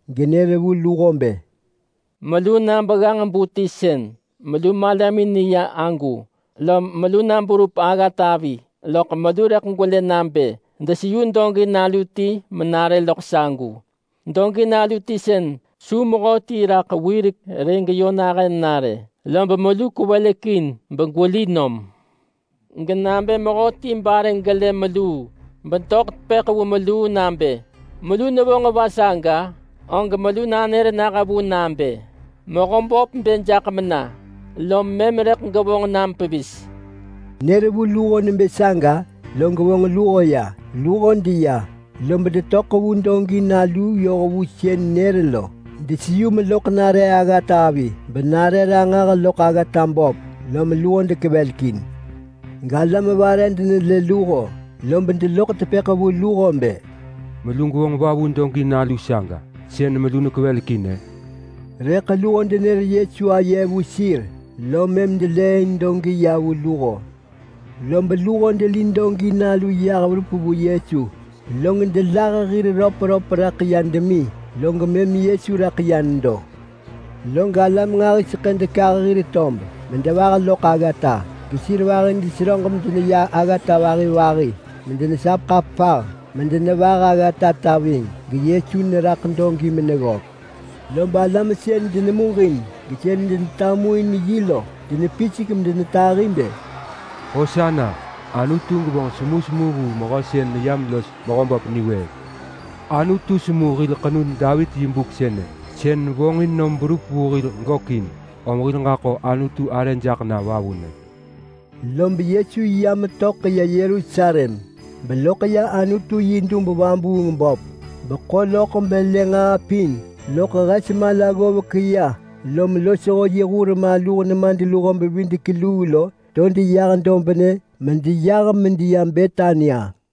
genër vu luho bë, “Melu na begganġ-bu ti sën melu malamin neya agu. Lob melu na berup aggatavi loḳ melu rëḳ gwelë nabë deseyu dogi nalu ti menare loḳ sagu. Dogi nalu ti sën su mehöti raḳ wirek rë geyö nahën nare, lob melu kwevelekin begweli nom. Genabë mehöti bare gelë meluu, bedoḳ tepëḳ vu meluu nabë, ‘Melu nevonġ va saga?’ og melu nanër nah vu nabë, ‘Mehöböp bë jaḳ mena!’ lob mëm rëḳ gevonġ nam pevis.” Nër vu luho nebë saga, log vonġ luho ya. Luho deya lob detöḳ vu dogi nalu yoh vu sën nër lo. Deseyu meloḳ nare aggatavi benare ranġah loḳ aggata böp, lom luho dekevelekin. Galam vare denelë luho, lob deloḳ tepëḳ vu luho bë, “Melu gwevonġ va vu dogi nalu saga sën melu nekwevelekin-ë?” Rëḳ luho denër Yesu aye vu sir, lom mëm delëëin dogi ya vu luho. Lob luho deli dogi nalu yah verup vu Yesu, log delah hir röpröp raḳ demi, log mëm Yesu raḳ ya nedo. Lob alam nġahiseḳë dekah hir tob medevah loḳ aggata, gesir vahi deneseröġ medeneya aggata vahi vahi medenesap ḳapah medenevah aggatata ving, geYesu neraḳ dogi meneggök. Lob alam sën denemuġin gesën denetamuin yi lo denepisek in medenetahi bë, “Hosana! Anutu gevonġ semusemu vu mehö sën neyam los Mehöböp niwëëk. Anutu semu hil ḳenud Davit yi buk sënë, sën vonġin nom berup vu hil gökin. Om hil ġaḳo Anutu arë jaḳ na vavunë!” Lob Yesu ya metöḳ ya Yerusalem beloḳ ya Anutu yi dub-vabuung-böp beḳo loḳ belë nġaa pin, loḳ hes mala ggovek ya lom losho yi hur maluh nemadluho-bevidek-luu lo to deyah dobnë medeyah medeya Betania.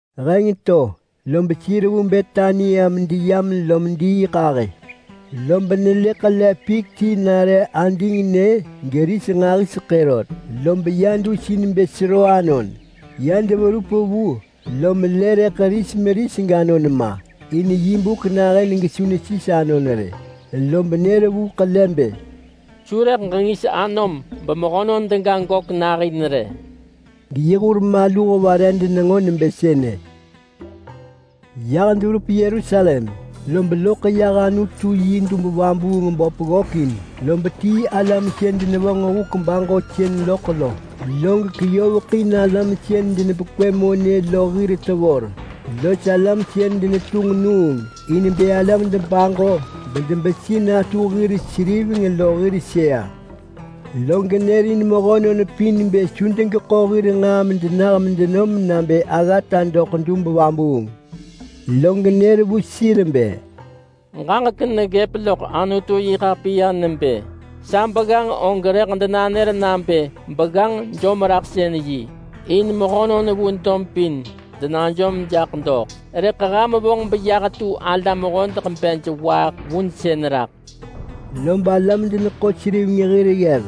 Heng to lob sir vu Betania medeyam lom diiḳahë, lob nelë ḳele pik ti nare adingnë geris nġahiseḳë rot, lob ya dus in bë sero anon. Ya deverup vu lom lë rëḳ ris meris ganon ma, in yi buk nahën gesu nesis anon rë. Lob nër vu ḳele bë, “Su rëḳ ġengis anom bemehönon dega gök nahin rë!” Geyi hur maluh vare denenġo nebë sënë. Yah deverup Yerusalem, lob loḳ yah Anutu yi dub-vabuung-böp ggökin, lob tii alam sën denevonġ huk baġosën loḳ lo. Log keyoveḳin alam sën denepekwë monë lo hir tevor, los alam sën denetunġ nuung in bë alam debaġo bedebesi natu hir seriveng lo hir sëa. Log nërin mehönon pin bë su degeḳo hir nġaa medenah medenom nabë aggata doḳ dub vabuung. Log nër vu sir bë, “Ġaġek neggëp loḳ Anutu-yi-ḳapiya nebë: ‘Sa begganġ og rëḳ denanër nabë begganġ-jom-raḳsën-yi in mehönon vu dob pin denajom jaḳ doḳ.’ Rëḳ ham vonġ beyah tu alam hodeḳ bej waaḳ vunsën raḳ.” Lob alam-deneḳo-seriveng hir ggev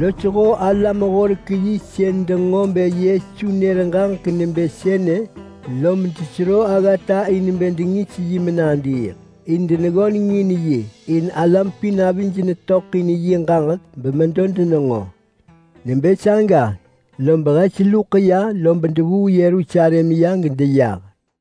losho alam-horek-yi sën denġo bë Yesu nër ġaġek nebë sënë lob desero aggata in bë dengis yi menadiiḳ. In deneggöneng in yi, in alam pin avij netöḳ in yi ġaġek bemedo denenġo. Nebë saga lob hes luḳ ya lob devuu Yerusalem ya gedeyah.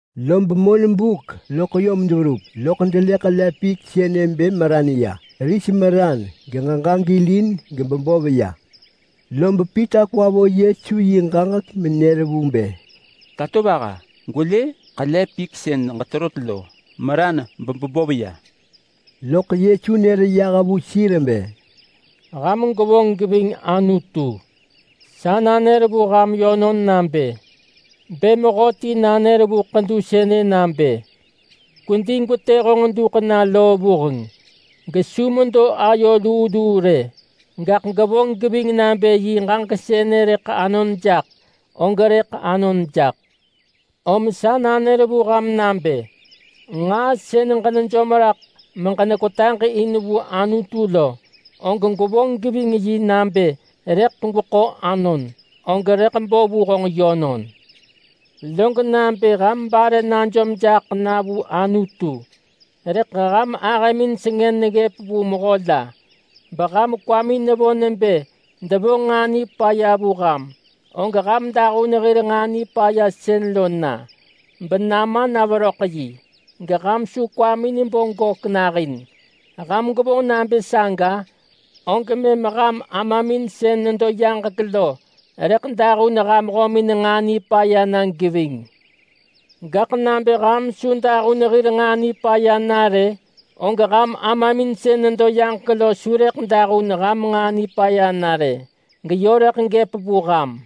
Lob monbuk loḳ yom deverup, loḳ delë ḳele pik sënë bë meran ya. Ris meran geġeġa gilin gebebov ya. Lob Pita kwa vo Yesu yi ġaġek menër vu bë, “Tatovaha! Gwelë! Ḳele pik sën ġeterot lo meran bebebov ya!” Loḳ Yesu nër yah vu sir bë, “Ham gwevonġ geving Anutu! Sa nanër vu ham yönon nabë: Bë mehöti nanër vu ḳedu sënë nabë, ‘Kwedi gwetë honġ duḳ na loo vuheng!’ gesu medo ayo luu luu rë, gaḳ gevonġ geving nabë yi ġaġek sënë rëḳ anon jaḳ, og rëḳ anon jaḳ. Om sa nanër vu ham nabë: Nġaa sën ġenejom raḳ meġenekwetaġ in vu Anutu lo, og gwevonġ geving yi nabë rëḳ gweḳo anon, og rëḳ bo vu honġ yönon. Log nabë ham bare najom jaḳ na vu Anutu, rëḳ ham ahëmin sengën neggëp vu mehö la, beham kwamin nevo nebë devonġ nġaa nipaya vu ham, og ham dahun hir nġaa nipaya sën lo na benama na veröḳ yi, geham su kwamin bo gök nahin. Ham gwevonġ nabë saga, og mëm ham Amamin sën nedo yaġek lo rëḳ dahun ham hömin nġaa nipaya na geving. [Gaḳ nabë ham su dahun hir nġaa nipaya na rë, og ham Amamin sën nedo yaġek lo su rëḳ dahun ham nġaa nipaya na rë, gaḳ yö rëḳ gëp vu ham.]”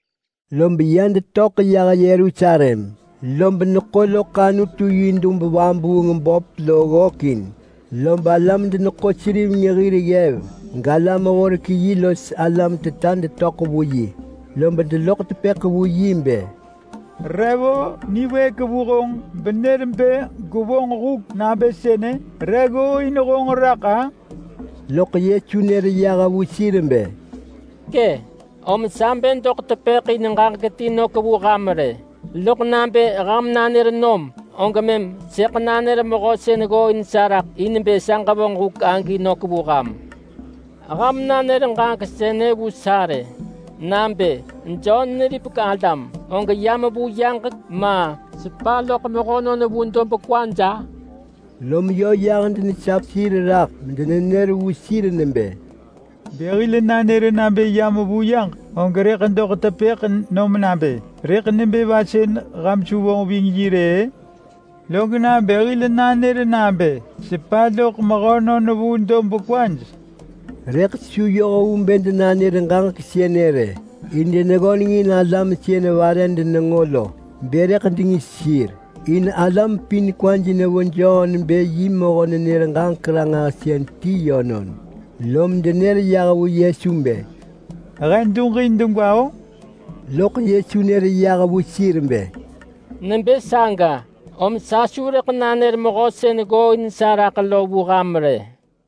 Lob ya detöḳ yah Yerusalem lob neḳo loḳ Anutu yi dub-vabuung-böp lo ggökin, lob alam-deneḳo-seriveng hir ggev, galam-horek-yi los alam teta detöḳ vu yi. Lob deloḳ tepëḳ vu yi bë, “Re vo niwëëk vu honġ benër bë gwevonġ huk nabë sënë? Re ggooin honġ raḳ-a?” Loḳ Yesu nër yah vu sir bë, “Kë, om sa bë doḳ tepëḳ in ġaġek ti nök vu ham rë, loḳ nabë ham nanër nom, og mëm sëḳ nanër mehö sën ggooin sa raḳ in bë sa ġevonġ huk agi nök vu ham. Ham nanër ġaġek sënë vu sa rë nabë: Jon neripek alam, og yam vu yaġek, ma, sepa loḳ mehönon vu dob kwaj?” Lom yö yah denesap sir raḳ medenenër vu sir nebë, “Bë hil nanër nabë yam vu yaġek, og rëḳ doḳ tepëḳ nom nabë, ‘Rëḳ nebë va sën ham su vonġ ving yi rë-ë?’ Log nabë hil nanër nabë sepa loḳ mehönon vu dob kwaj...?” Rëḳ su yoh vu bë denanër ġaġek sënë rë, in deneggöneng in alam sën vare denenġo lo bë rëḳ dengis sir. In alam pin kwaj nevo Jon bë yi mehö-nenër-ġaġek-ranġahsën ti yönon. Lom denër yah vu Yesu bë, “He duġin degwa-o!” Loḳ Yesu nër yah vu sir bë, “Nebë saga, om sa su rëḳ nanër mehö sën ggooin sa raḳ lo vu ham rë!”